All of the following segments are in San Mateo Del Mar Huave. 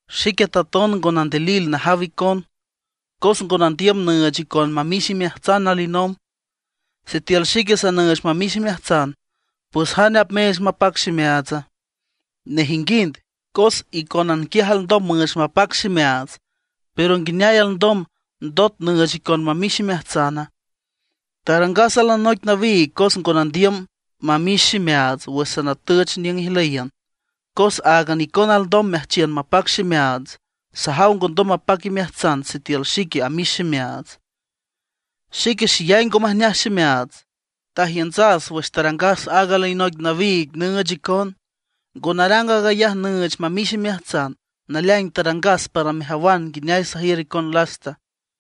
Xique taton ngo nandilil najaw icon, cos ngo nandiüm nüüch icon mamix imeajtsan alinomb. Sitiül xique nüüch mamix imeajtsan, ¿pues jane apmeech mapac ximeaatsa? Nejinguind, cos icónan quiaj alndom müüch mapac ximeaats. ¿Pero nguineay alndom, ndot nüüch icon mamix imeajtsana? Tarangas alinoic nawiig cos ngo nandiüm mamix ximeaats wüx sanatüch niüng ijlüyiün. Cos áagan icona alndom meajchiün mapac ximeaats; sajaw ngondom mapac imeajtsan sitiül xique amix ximeaats. Xique xeyay ngo majneaj ximeaats, tajiüntsas wüx tarangas aaga alinoic nawiig nüüch icon. Ngo narang aag ayaj nüüch mamix imeajtsan, naleaing tarangas para mejawan nguineay sajiür icon lasta.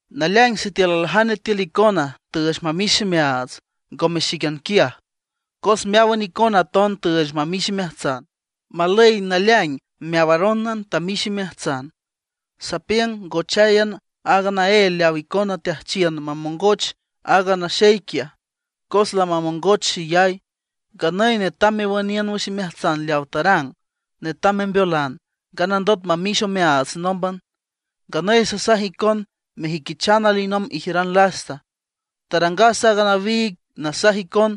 Naleaing sitiül aljane tiül icona tüüch mamix ximeaats, ngome xíquian quiaj, cos meáwan icona aton tüüch mamix imeajtsan. Malüy naleaing meawarónan tamix imeajtsan. Sapiüng ngocháyan aaga naél leaw icona teajchiün mamongoch aaga naxey quiaj, cos lamamongoch xeyay. Nganüy netam mewüniün wüx imeajtsan leaw tarang, netam membeolan, nganandot mamix omeaats nómban. Nganüy sasaj icon mejüiquichan alinomb ijiüran lasta. Tarangas aaga nawiig nasaj icon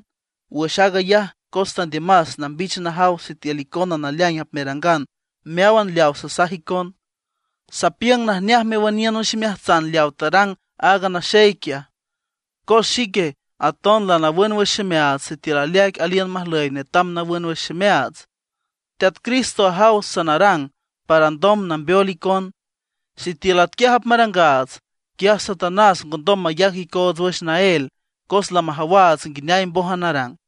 wüx aag ayaj cos tandiümas nambich najaw sitiül icona naleaing apmerangan meáwan leaw sasaj icon. Sapiüng najneaj mewüniün wüx imeajtsan leaw tarang aaga naxey quiaj, cos xique aton lanawün wüx ximeaats. Sitiül aleaic aliün majlüy netam nawün wüx ximeaats, Teat Cristo ajaw sanarang para alndom nambeol icon. Sitiül atquiaj apmarangaats, quiaj Satanás ngondom mayac icoots wüx naél, cos lamajawaats nguineay mbójan arang.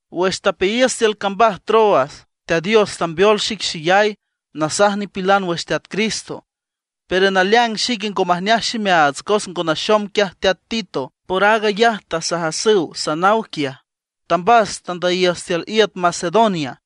Wüx tapeayiüs tiül cambaj Troas, Teat Dios tambeol xic xeyay nasaj nipilan wüx Teat Cristo. Pero naleaing xique ngo majneaj ximeaats, cos ngo naxom quiaj teat Tito. Por aag ayaj tasajasüw sanaw quiaj; tambas tandüyiüs tiül iüt Macedonia.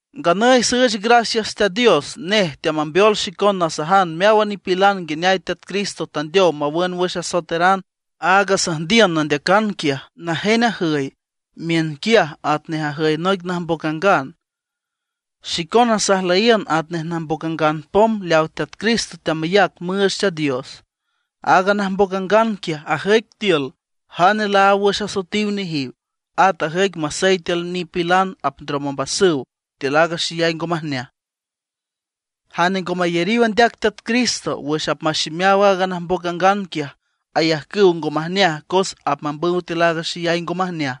Nganüy süüch gracias Teat Dios, nej teamambeol xicon nasajan meáwan nipilan nguineay Teat Cristo tandeow mawün wüx asoetaran. Aaga süjndiün nandeacan quiaj, najen ajüy miünquiaj atnej ajüy noic najmboc angan. Xicona sajlüyiün atnej najmboc angan pom leaw Teat Cristo teamayac müüch Teat Dios. Aaga najmboc angan quiaj, ajüic tiül jane laáw wüx asoetiw nejiw, at ajüic masey tiül nipilan apndrom ombasüw tiül aaga xeyay ngo majneaj. Jane ngo mayariw andeac Teat Cristo, wüx apmaximeaw aaga najmboc angan quiaj, ayajcüw ngo majneaj cos apmambüw tiül aaga xeyay ngo majneaj.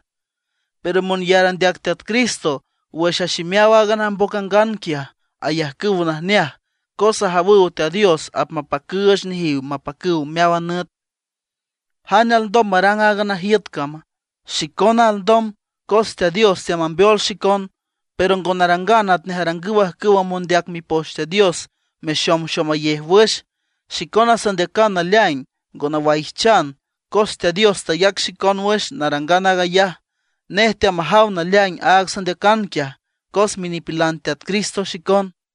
Pero monyar andeac Teat Cristo, wüx aximeaw aaga najmboc angan quiaj, ayajcüw najneaj cos ajawüw Teat Dios apmapacüüch nejiw mapacüw meáwan nüt. ¿Jane alndom marang aaga najiüt cama? Xicona alndom, cos Teat Dios teamambeol xicon. Pero ngo narangan atnej arangüw ajcüwa mondeac Mipoch Teat Dios mexomxomayej wüx. Xicona sandeacan naleaing, ngo nawaijchan, cos Teat Dios tayac xicon wüx narangan aag ayaj, nej teamajaw naleaing aaga sandeacan quiaj, cos minipilan Teat Cristo xicon.